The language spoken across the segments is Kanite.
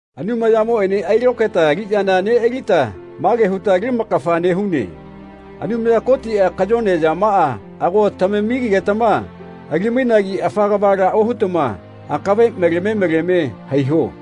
Anumayamoꞌene ailokaeta aliꞌyana neꞌalita mage huta ali lamakafa nehune. Anumaya Kotiꞌa kayone yamaꞌa ago tamamigetama ali-mainagi afa kavala ohutama akave maleme maleme haiho.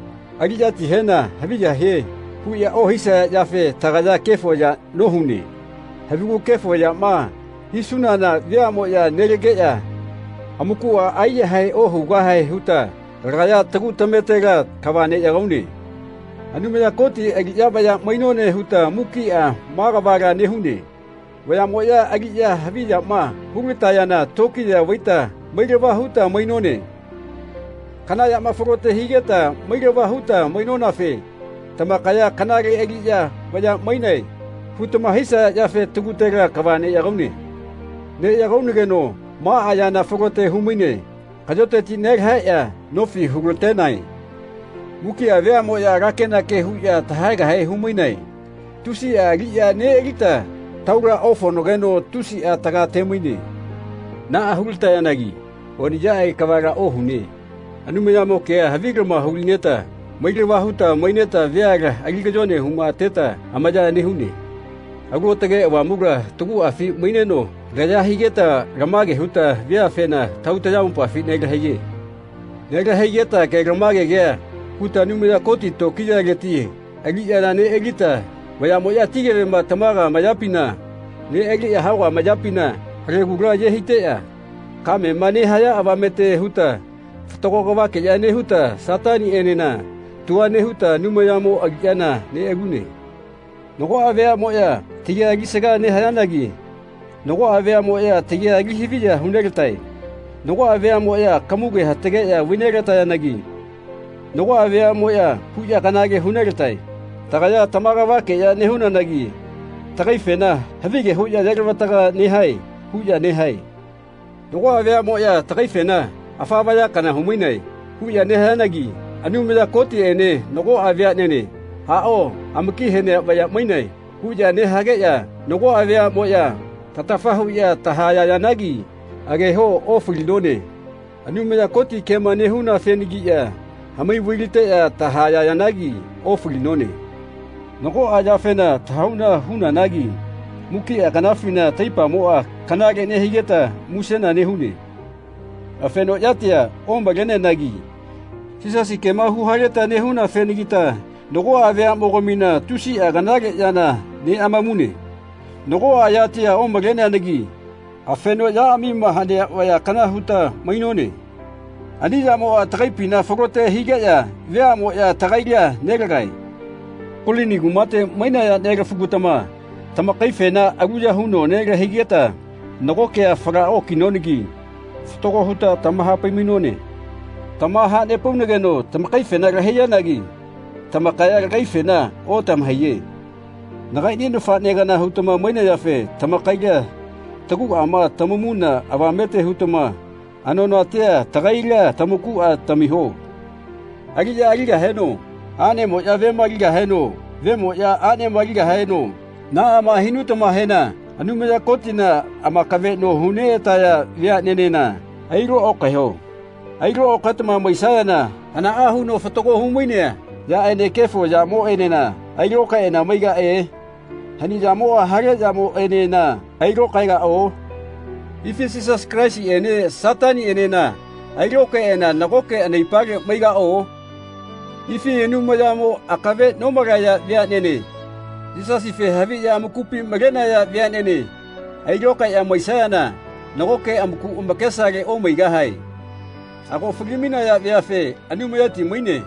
Aliꞌyatihena “Haviya hie.” huꞌya ohisaya yafe tagaya kefo yana nohune. Havigu kefo yama hisunana veaꞌmoꞌya nelageꞌya amakuꞌa aiyahae ohugahae huta lagaya tagu tametela kava neꞌyagaune. Anumaya Koti aliꞌya vaya mainone huta mukiꞌa maꞌa kavala nehune. Vayamoꞌya aliꞌya haviyama hulatayana tokiya vaita mailava huta mainone. Kana yama falote higeta mailava huta mainonafe tamakaya “Kanale aliꞌya vayaꞌa mainae.” hutama hisaya yafe tagutela kava neꞌyagaune. Neꞌyagaunageno maꞌa yana falote humaine kaꞌyoteti nelahaeꞌya nofi hulatenae. Mukiꞌa veaꞌmoꞌya alakenake huꞌya tahaegahe humainae. Tusiꞌa aliꞌya neꞌalita taula ofaonageno tusiꞌa tagate-maine. Naꞌa hulatayanagi oniꞌyaꞌage kavala ohune. Anumayamo kea havilama hulineta mailava huta maineta veala ali kayone humateta amaya nehune. Alu Aotage Avamula taguꞌafi maineno laya higeta lamage huta veafena tahau tayamopafi nelahaiye. Nelahaigeta kelamage kea huta Anumaya Koti tokiyaleti aliꞌyana neꞌalita vayaꞌmoꞌya ati kevema tamaga amayapina neꞌaliꞌya hauga amayapina halegula aye haiteꞌya kamema nehaya avamete huta fatago kavakeꞌya nehuta Sataniꞌenena tua nehuta Anumayamo aliꞌyana neꞌalune Nagoꞌa veaꞌmoꞌya tagia alisaga nehayanagi nagoꞌa veaꞌmoꞌya tagia ali haviya hunelatae. Nagoꞌa veaꞌmoꞌya kamugea hatageꞌya vainelayanagi nagoꞌa veaꞌmoꞌya huꞌya kanale hunelatae. Tagaya tama kavakeꞌya nehunanagi tagaifena “Havige huꞌya ayelavataga nehae.” huꞌya nehae. Nagoꞌa veaꞌmoꞌya tagaifena “Afa vaya kana humainae.” huꞌya nehayanagi Anumaya Kotiꞌene nagoꞌa veaꞌnene “Aꞌao amaki hanea vaya mainae.” huꞌya nehageꞌya nagoꞌa veaꞌmoꞌya tatafa huꞌya tahayayanagi ageho ofalinone. Anumaya Koti kema nehunafenagiꞌya hamai vailateꞌya tahayayanagi ofalinone. Nagoꞌa yafena tahauna hunanagi mukiꞌa kanafina taipamoꞌa kanale nehigeta musena nehune. Afeno yatia omaleanagi Yisasi kema huhaleta nehunafenagita nagoꞌa veaꞌmogamina tusiꞌa kanale yana neꞌamamune. Nagoꞌa yatia omaleanagi afeno yaꞌamima hanea vaya kana huta mainone. Ani yamoꞌa tagaipina falote higeꞌya veaꞌmoꞌya tagaila nelagae. Kolini kumate mainaya nelafugatama tamakaifena aluya huno nelahaigeta nago kea fala okinonagi fatago huta tamahapai-mainone. Tamahanepaunageno tamakaifena lahaiyanagi tamakaya tagaifena otamahaiye. Nagaiꞌni nafaꞌne kana hutama mainayafe tamakaila taguꞌama tamamuna avamete hutama anonatia tagaila tamakuꞌa tamiho. Aliꞌya aligaheno aꞌnemoꞌya vema aligaheno vemoꞌya aꞌnema aligaheno naꞌama hinutamahena Anumaya Kotina amakaveꞌno huneꞌataya veaꞌnenena ailo okaeho. Ailokaetama maisayana hanaꞌa huno fatago humainea yaꞌene kefo yamoꞌenena ailokaeꞌana maigaꞌe? Hani yamoꞌa hale yamoꞌenena ailokaegaꞌo? Ifi Yisasi Kalaisiꞌene Sataniꞌenena ailokaeꞌana nagoke anaipale maigaꞌo? Ifi Anumayamo akave nomalaya veaꞌnene Yisasife haviꞌya amakupi malenaya veaꞌnene ailokaeꞌya maisayana nagoke amaku amakesale omaigahae. Ago fali-mainaya veafe “Anumayati maine.”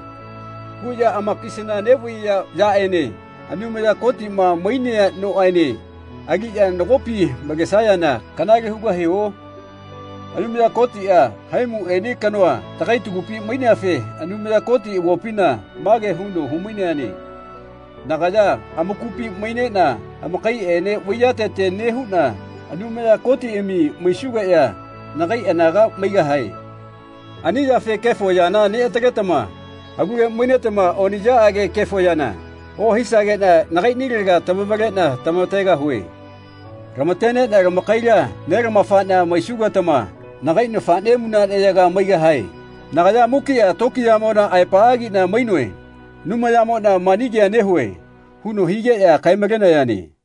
huꞌya amakisana neꞌvaiya yaꞌene Anumaya Kotiꞌma mainea noꞌene aliꞌya nagopi malesayana kanale hugahio? Anumaya Kotiꞌa haimuꞌene kanoa tagai tagupi maineafe Anumaya Koti avopina mage huno hu-maineane “Nagaya amakupi maineꞌna amakaiꞌene vaiyatete nehuꞌna Anumaya Kotiꞌami maisugeꞌya nagai anaga maigahae. Ani yafe kefo yana neꞌataletama alule mainetama oniꞌyaꞌage kefo yana ohisageꞌna nagaiꞌnilega tamavaleꞌna tamategahue. Lamateneꞌna tamakaila nelamafaꞌna maisugetama nagai nafaꞌne munaꞌneyaga maigahae. Nagaya mukiꞌa tokiyamona aepaꞌagiꞌna mainoe. Anumayamoꞌna, mani kea nehue.” huno higeꞌya kae-malenayane.